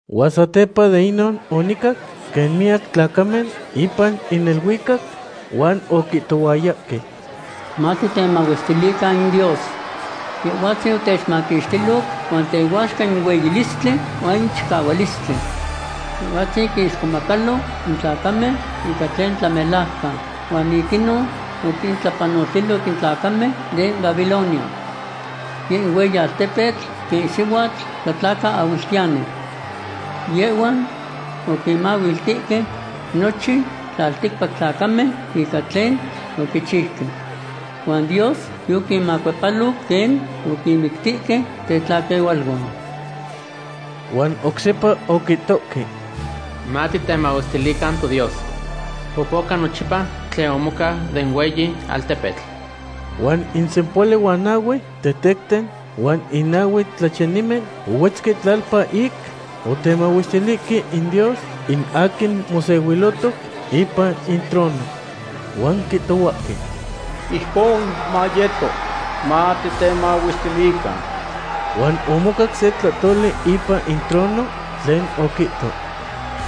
Huan satepa de inon onicac quen miyac tlacamen ipan in neluicac, huan oquihtohuayahque: ¡Matitemahuestilican in Dios! Yehhuatzin otechmaquixtiloc huan tehuaxca in hueyilistli huan in chicahualistli. Yehhuatzin quinixcomacalo in tlacamen ica tlen tlamelajcan. Huan ic inon oquintlapanoltiloc in tlacamen den Babilonia. Yeh in hueyi altepetl quen in sihuatl tlacaahuiltiyani. Yehhuan oquinmahualtihque nochin tlalticpac tlacamen ica tlen oquichiuque. Huan Dios yoquinmacuepaloc quen oquinmictihque tetlaquehualuan. Huan oc sepa oquihtohque: ―¡Matitemahuestilican toDios! Popoca nochipa tlen omocau den hueyi altepetl. Huan in sempohuali huan nahue tetecten huan in nahue tlachiyanimen ohuetzque tlalpa ic otemahuestilihque in Dios, in aquin mosehuilotoc ipan in trono. Huan quihtohuahque: ―¡Ijcon mayeto! ¡Matitemahuestilican! Huan omocac se tlahtoli ipan in trono tlen oquihto: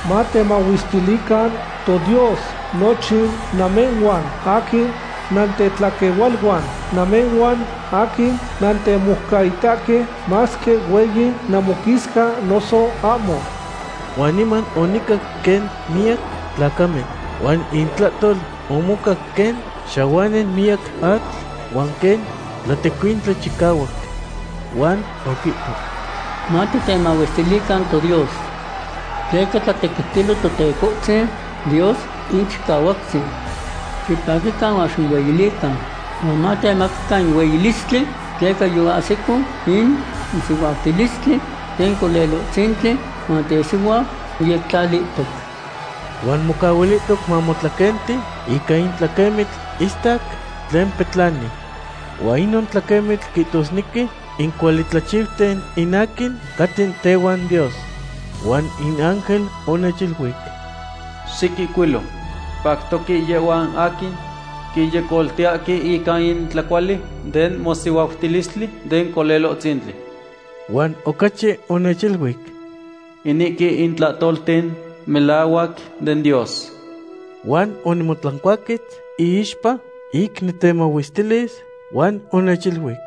Matemahuestilican toDios nochin namehhuan aquin nantetlaquehualuan, namehhuan aquin nantemoucaitahque, masque hueyi namoquisca noso ahmo. Huan niman onicac quen miyac tlacamen. Huan intlahtol omocac quen xahuani miyac atl, huan quen tlatecuintli chicahuac. Huan oquihto: Matitemahuestilican toDios. Tleca tlatequiutilo Totecohtzin Dios in Chicahuactzin. Xipaquican huan ximohueyilican huan matemacacan in hueyilistli, tleca yoahsico in mosihuautilistli den Colelohtzintli, huan tesihuau moyectlalihtoc. Huan mocahuilihtoc mamotlaquenti ica in tlaquemitl istac tlen petlani. Huan inon tlaquemitl quihtosnequi in cuali tlachiuten in aquin caten tehuan Dios. Huan in ángel onechiluic: ―Xiquihcuilo: “Pactoque yehhuan aquin quinyecoltiyahque ica in tlacuali den mosihuautilistli den Colelohtzintli.” Huan ocachi onechiluic: ―Inihque in tlahtolten melahuac den Dios. Huan onimotlancuaquetz iixpa ic nicmahuestilis, huan onechiluic: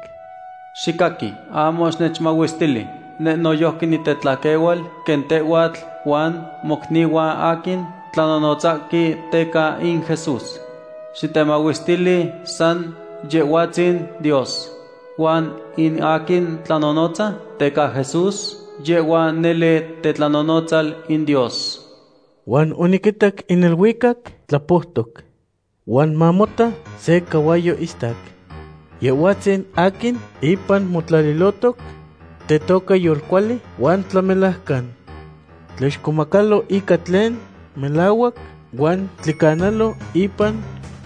―¡Xicaqui, ahmo xinechmahuestili! Neh noyojqui nitetlaquehual quen tehhuatl huan mocnihuan aquin tlanonotzahque teca in Jesús. Xitemahuestili san Yehhuatzin Dios. Huan in aquin tlanonotza teca Jesús, yehhua nele tetlanonotzal in Dios. Huan oniquitac in neluicac tlapoutoc. Huan mamota, se cahuayo istac. Yehhuatzin aquin ipan motlalilotoc tetoca Yolcuali huan Tlamelajcan. Tlixcomacalo ica tlen melahuac huan tlicanalo ipan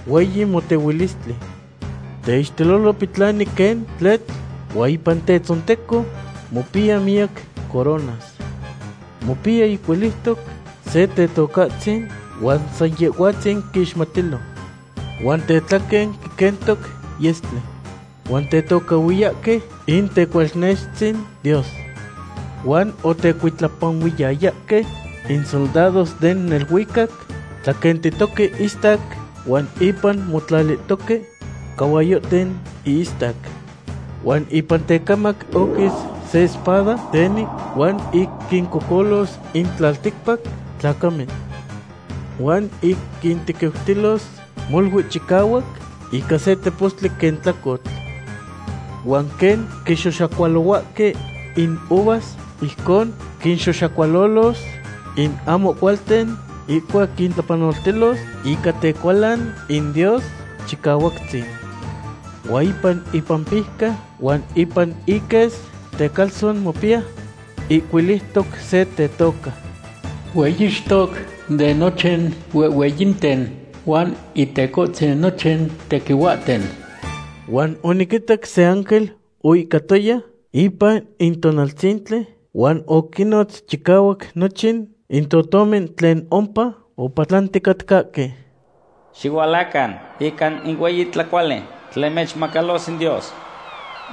hueyi motehuilistli. Teixtelolo petlani quen tletl huan ipan tetzonteco mopiya miyac coronas. Mopiya ihcuiliutoc se Tetocahtzin huan san Yehhuatzin quixmatilo. Huan tetlaquen quiquentoc yestli. Huan tetocahhuiyahque in Tecualnextzin Dios. Huan otecuitlapanuiyayahque in soldados den neluicac tlaquentitoque istac huan ipan motlalihtoque cahuayohten ihistac. Huan ipan tecamac oquis se espada teni huan ic quincocolos in tlalticpac tlacamen. Huan ic quintequiutilos molui chicahuac ica se tepostli quen tlacotl. Huan quen quixoxacualohuahque in uvas, ijcon quinxoxacualolos in ahmo cualten ihcuac quintlapanoltilos ica tecualan in Dios Chicahuactzin. Huan ipan ipampijca huan ipan iques tecalzon mopiya ihcuiliutoc se tetoca: “Hueyixtoc de nochin huehhueyinten huan Intecohtzin nochin tequihuahten.” Huan oniquitac se ángel oihcatoya ipan in tonaltzintli huan oquinnotz chicahuac nochin in totomen tlen ompa opatlanticatcahque: ―Xihualacan ica in hueyi tlacuali tlen mechmacalos in Dios.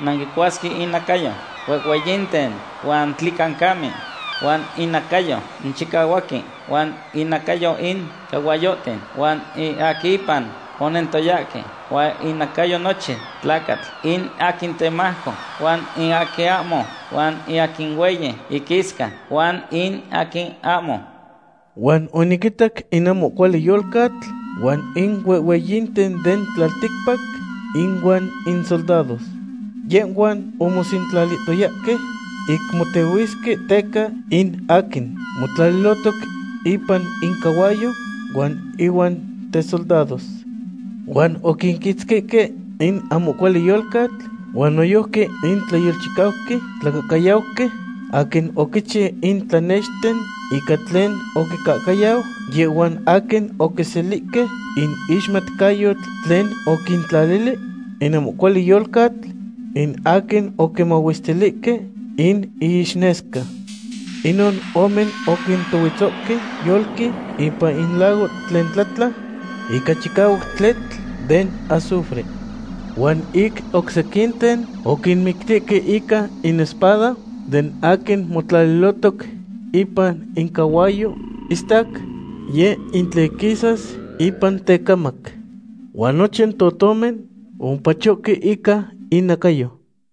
Nanquicuasque inacayo huehhueyinten huan tlicancamen, huan inacayo in chicahuaquen, huan inacayo in cahuayohten huan in aquin ipan onentoyahque, huan inacayo nochin tlacatl, in aquin temajco huan in aquin ahmo, huan in aquin hueyi iquisca huan in aquin ahmo. Huan oniquitac in ahmo cuali yolcatl huan in huehhueyinten den tlalticpac inuan insoldados. Yehhuan omosentlalihtoyahque ic motehuisque teca in aquin motlalilotoc ipan in cahuayo huan inuan tesoldados. Huan oquiquitzquihque in ahmo cuali yolcatl, huan noyojqui in tlayolchicauqui tlacahcayauqui aquin oquichiu in tlanexten ica tlen oquincahcayau yehhuan aquin oquiselihque in ixmatcayotl tlen oquintlalili in ahmo cuali yolcatl, in aquin oquimahuestilihque in iixnesca. Inon ome oquintohuetzohque yolqui ipan in lago tlen tlatla ica chicahuac tletl den azufre. Huan in oc sequinten oquinmictihque ica in espada den aquin motlalilotoc ipan in cahuayo istac, yeh in tlen quisas ipan tecamac. Huan nochin totomen omopachohque ica innacayo.